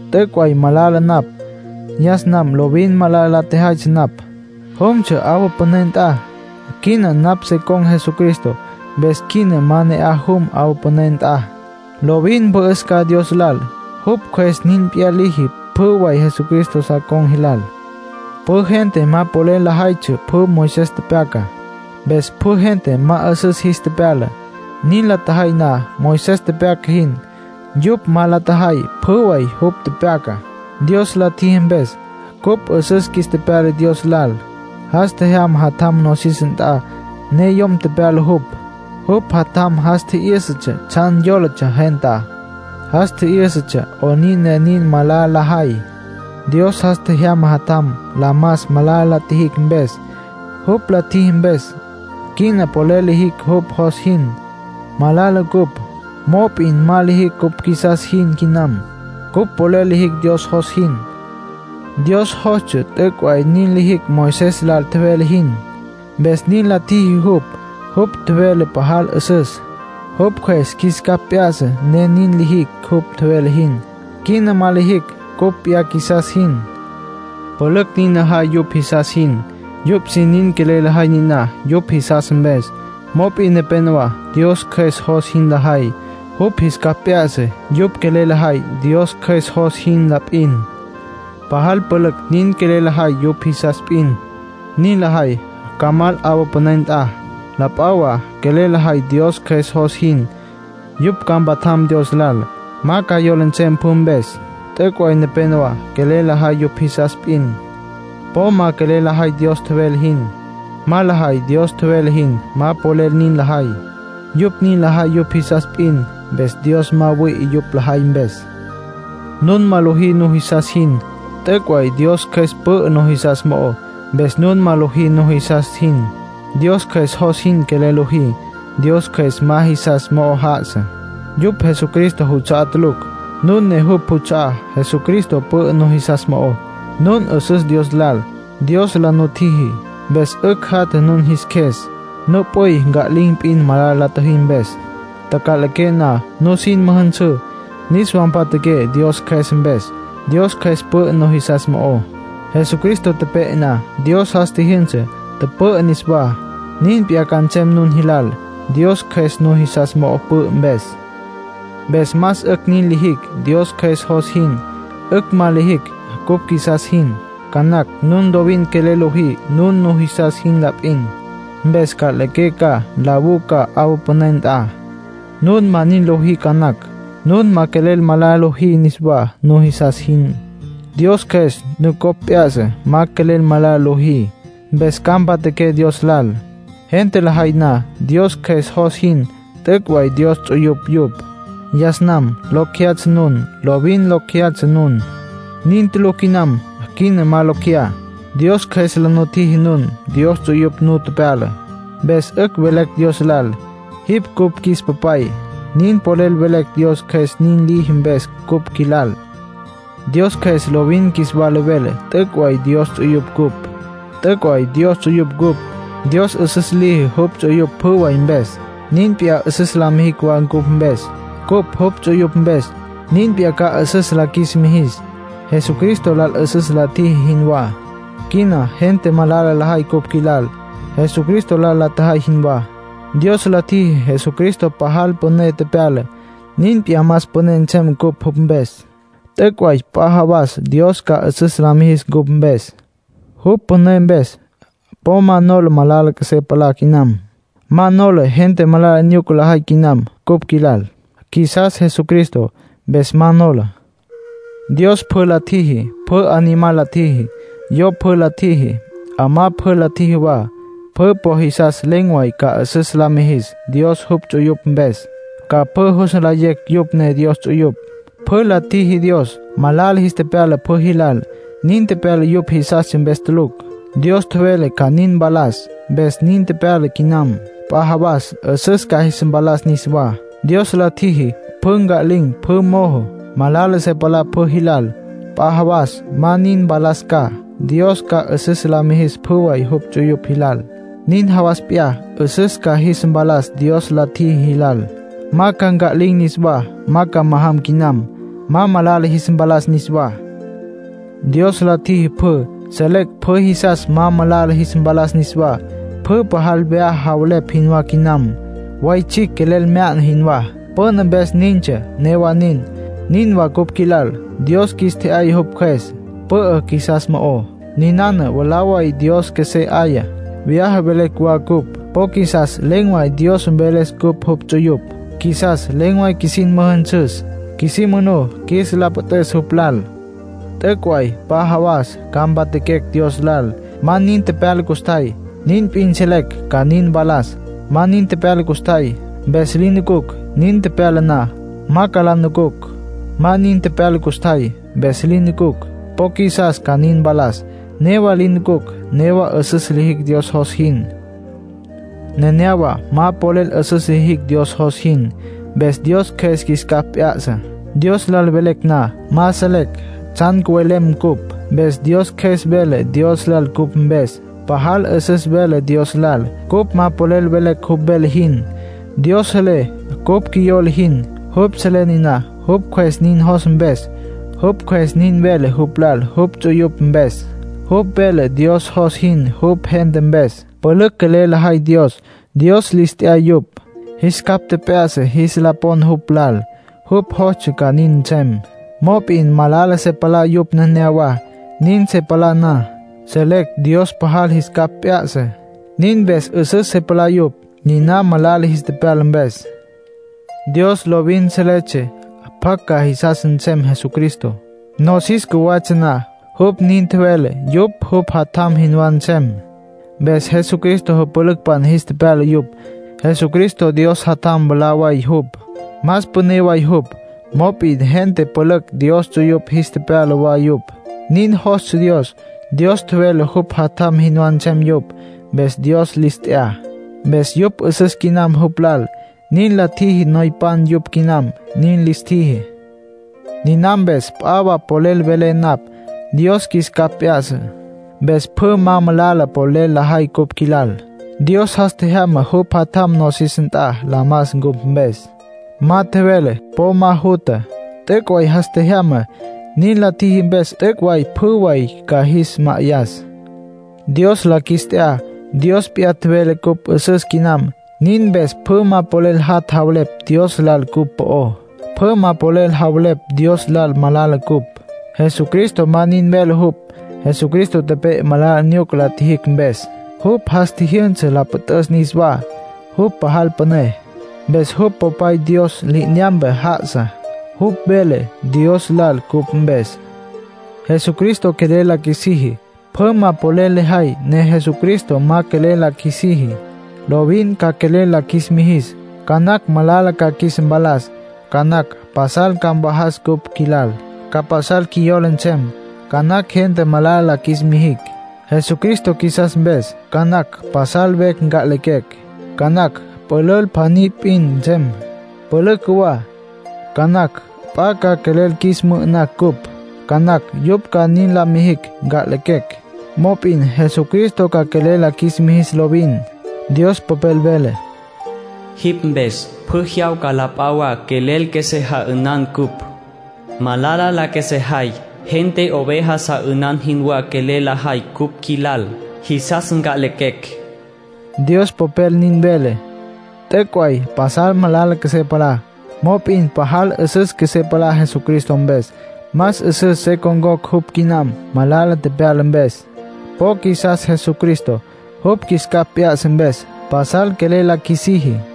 T'üc' way malala napj. Yas nam lovin malala la tjejaytsja napj. Jumtsja 'awa püné nt'a. Quina napj se con̈ Jesucristo, mpes quina ma ne'aj jum 'awa püné nt'a. Lovin mpü'üs ca Dios lal. Jupj Cjües nin p'iyá liji pjü way Jesucristo sa con̈ jilal. Pjü gente ma polel lajaytsja pjü Moisés tepyacá. Mpes pjü gente ma 'üsüs jis tepyala, nin la tjajay na Moisés tepyaca jin; yupj ma la tjajay pjü way jupj tepyacá. Dios la tjiji mpes cupj 'üsüs qjuis tepyala Dios lal. Jas tjejyama Jatjam nosis nt'a, ne yom tepyala jupj. Jupj Jatjam jas tji'yǘsatsja tsjan yólatsja gentá. Jas tji'yǘsatsja 'onin ne nin malala lajay. Dios jas tjejyama Jatjam la mas malala la tjijicj mpes. Jupj la tjiji mpes, quina polel lijicj jupj jos jin. Malala cupj, mop'in ma lijicj cupj qjuisas jin quinam. Cupj polel lijicj Dios jos jin. Dios jostsja t'üc' way nin lijicj Moisés lal tjevele jin, mpes nin la tjiji jupj. Jupj tjevele pajal 'üsüs. Jupj Cjües qjuis capj p'ya'sa ne nin lijicj jupj tjevele jin. Quina ma lijicj cupj p'iyá qjuisas jin. Pülücj nin lajay yupj jisas jin. Yupj sin nin quelel lajay niná yupj jisas mpes. Mop'in nepénowa Dios Cjües jos jin lajay. Jupj jis capj p'ya'sa. Yupj quelel lajay Dios Cjües jos jin la p'in. Pajal pülücj nin quelel lajay yupj jisas p'in. Nin lajay ca mal 'awa püné nt'a. La p'a wa quelel lajay Dios Cjües jos jin. Yupj ca mpatjam Dios lal. Ma ca yola nsem pjü mpes. T'üc' way nepénowa quelel lajay yupj jisas p'in. Po ma quelel lajay Dios tjevele jin. Ma lajay Dios tjevele jin. Ma polel nin lajay. Yupj nin lajay yupj jisas p'in, mpes Dios ma wüi'i yupj lajay mpes. Nun ma lojí nujisas jin; t'üc' way Dios Cjües pü'ü nujisas mo'ó, mpes nun ma lojí nun jisas jin. Dios Cjües jos jin quelel lojí. Dios Cjües ma jisas mo'o já'asa, yupj Jesucristo juts'a'á tulucj. Nun ne jupj juts'a'á. Jesucristo pü'ü nujisas mo'ó. Nun 'üsüs Dios lal, Dios la nutjiji, mpes 'ücj jatja nun jis qjues. Nup'üy nca'lin̈ p'in, malala la tjüjí mpes. Taca'liqué na, nusin müjünsǘ, niswa mpatjaqué Dios Cjües mpes. Dios Cjües pü'ü nujisas mo'ó. Jesucristo tepe'e na, Dios jas tjijyünsa, tüpü'ü niswá. Nin p'iyá ca nsem nun jis lal, Dios Cjües nujisas mo'o pü'ü mpes. Mpes más 'ücj nin lijicj Dios Cjües jos jin. 'Ücj ma lijicj cupj qjuisas jin. Ca nacj nun lovin quelel lojí nun nujisas jin la p'in. Mpes nca'liqué ca, nlawú ca 'awa püné nt'a. Nun ma nin lojí ca nacj. Nun ma quelel malala lojí niswá nujisas jin. Dios Cjües nucopj p'ya'sa, ma quelel malala lojí. Mpes ca mpatjaqué Dios lal. Gente lajay na Dios Cjües jos jin, t'üc' way Dios ts'uyupj yupj. Yas nam locj jeyatsja nun. Lovin locj jeyatsja nun. Nin tulucj quinam. Quina ma locj jeyá. Dios Cjües la nutjiji nun Dios ts'uyupj nu tepyala. Mpes 'ücj velecj Dios lal: “Jipj cupj qjuis Papay”; nin polel velecj Dios Cjües nin liji mpes cupj qjuilal. Dios Cjües lovin qjuis wala vele t'üc' way Dios ts'uyupj cupj. T'üc' way Dios ts'uyupj cupj. Dios 'üsüs liji jupj ts'uyupj pjü way mpes. Nin p'iyá 'üsüs la mijis wa cupj mpes, cupj jupj ts'uyupj mpes. Nin p'iyá ca 'üsüs la qjuis mijis, Jesucristo lal 'üsüs la tjiji jinwá. Quina gente malala lajay cupj qjuilal, Jesucristo lal la tjajay jinwá. Dios la tjiji Jesucristo pajal püné tepyala; nin p'iyá más püné nsem cupj jupj mpes. T'üc' way p'a jawas Dios ca 'üsüs la mijis cupj mpes, jupj püné mpes. Po ma nola malala qjuesé palá quinam. Ma nola gente malala nyuca lajay quinam cupj qjuilal. Qjuisas Jesucristo, mpes ma nola. Dios pjü la tjiji. Pjü animal la tjiji. Yo pjü la tjiji. 'Amá pjü la tjiji wa. Pjü po jisas len̈ way ca 'üsüs la mijis Dios jupj ts'uyupj mpes. Ca pjü jus nlayecj yupj ne Dios ts'uyupj. Pjü la tjiji Dios. Malala jis tepyala pjü jilal. Nin tepyala yupj jisastsja mpes tulucj. Dios tjevele ca nin mpalas, mpes nin tepyala quinam. P'a jawas 'üsüs ca jis mpalas niswá. Dios la tjiji pjü cya'lin̈, pjü mojo. Malala se palá pjü jilal. P'a jawas ma nin mpalas ca. Dios ca 'üsüs la mijis pjü way jupj ts'uyupj jilal. Nin jawas p'iyá, 'üsüs ca jis mpalas Dios la tjiji jilal. Ma ca nca'lin̈ niswá, ma ca majam quinam. Ma malala jis mpalas niswá. Dios la tjiji pjü; selecj pjü jisas ma malala jis mpalas niswá. Pjü pajal vyaja javelepj jinwá quinam, way tsjicj quelel mya'na jinwá. Püna mpes nintsja; newa nin. Nin wa cupj qjuilal. Dios qjuis tje'yaya jupj Cjües. Pü'ü qjuisas mo'ó. Ninana mwalá way Dios qjuesé 'aya. Vyaja velecj wa cupj; po qjuisas len̈ way Dios mveles cupj jupj ts'uyupj. Qjuisas len̈ way qjuisin müjünsüs, qjuisí manú qjuis la püt'üs jupj lal. T'üc' way p'a jawas ca mpatjaquecj Dios lal. Ma nin tepyala custjay, nin p'in selecj ca nin mpalas. Ma nin tepyala custjay, mpes li nucucj. Nin tepyala na, ma ca la nucucj. Ma nin tepyala custjay, mpes li nucucj. Po qjuisas ca nin mpalas. Newa li nucucj; newa 'üsüs lijicj Dios jos jin. Nenéyawa ma polel 'üsüs lijicj Dios jos jin. Mpes Dios Cjües qjuis capj p'ya'sa. Dios lal velecj na, ma selecj tsjan cüvelem cupj. Mpes Dios Cjües vele Dios lal cupj mpes. Pajal 'üsüs vele Dios lal. Cupj ma polel velecj jupj vele jin. Dios selé cupj qjuiyola jin. Jupj selé niná jupj Cjües nin jos mpes. Jupj Cjües nin vele jupj lal jupj ts'uyupj mpes. Jupj vele Dios jos jin jupj gente mpes. Pülücj quelel lajay Dios. Dios lis t'ya yupj. Jis capj tjep'ya'sa jis la pon jupj lal. Jupj jostsja ca nin nsem. Mop'in malala se palá yupj nenéyawa. Nin se palá na, selecj Dios pajal jis capj p'ya'sa; nin mpes 'üsüs se palá yupj, niná malala jis tepyala mpes. Dios lovin seletsja pjacj ca jisas nsem Jesucristo. Nosis cjuwatsja na, jupj nin tjevele yupj jupj Jatjam jinwá nsem. Mpes Jesucristo jüpülücpan jis tepyala yupj. Jesucristo Dios Jatjam mwalá way jupj, más püné way jupj, mop'in gente pülücj Dios ts'uyupj jis tepyala wa yupj. Nin jostsja Dios. Dios tjevele jupj Jatjam jinwá nsem yupj. Mpes Dios lis t'ya. Mpes yupj 'üsüs quinam jupj lal, nin la tjiji. Noypan yupj quinam, nin lis tjiji. Niná mpes p'a wa polel velé napj. Dios qjuis capj p'ya'sa, mpes pjü ma malala polel lajay cupj qjuilal. Dios jas tjejyama jupj Jatjam nosis nt'a la mas cupj mpes. Ma tjevele po ma jutja. T'üc' way jas tjejyama. Nin la tjiji mpes t'üc' way pjü way ca qjuis ma'ayas. Dios la qjuis t'ya. Dios p'iyá tjevele cupj 'üsüs quinam; nin mpes pjü ma polel jat' javelepj Dios lal cupj po'ó. Pjü ma polel javelepj Dios lal malala cupj. Jesucristo ma nin vele jupj. Jesucristo tepe'e malala nyuca la tjijicj mpes. Jupj jas tjijyünsa la püt'üs niswá. Jupj pajal püné, mpes jupj Popay Dios li'inyampe já'asa. Jupj vele Dios lal cupj mpes. Jesucristo quelel la qjuisiji. Pjü ma polel lajay ne Jesucristo ma quelel la qjuisiji. Lovin ca quelel la qjuis mijis. Ca nacj malala ca qjuis mpalas. Ca nacj pasal ca mvajas cupj qjuilal, ca pasal qjuiyola nsem. Ca nacj gente ca malala la qjuis mijicj, Jesucristo qjuisas mpes. Ca nacj pasal vecj nca'lequecj. Ca nacj pülül pjaní p'in nsem, pülücj cjuwá. Ca nacj p'a ca quelel qjuis mü'ü'nas cupj. Ca nacj yupj ca nin la mijicj, nca'lequecj. Mop'in Jesucristo ca quelel la qjuis mijis lovin. Dios Popel vele: “Jipj mpes, pjü jyawca la p'a wa quelel qjuesé ja'ünan cupj. Malala la qjuesejay. Gente oveja sa 'ünan jinwá quelel lajay cupj qjuilal. Jisas nca'lequecj”, Dios Popel nin vele. T'üc' way pasal malala qjuesé palá; mop'in pajal 'üsüs qjuesé palá Jesucristo mpes. Más 'üsüs se con̈cocj jupj quinam, malala tepyala mpes. Po qjuisas Jesucristo, jupj qjuis capj p'ya'sa mpes. Pasal quelel la qjuisiji.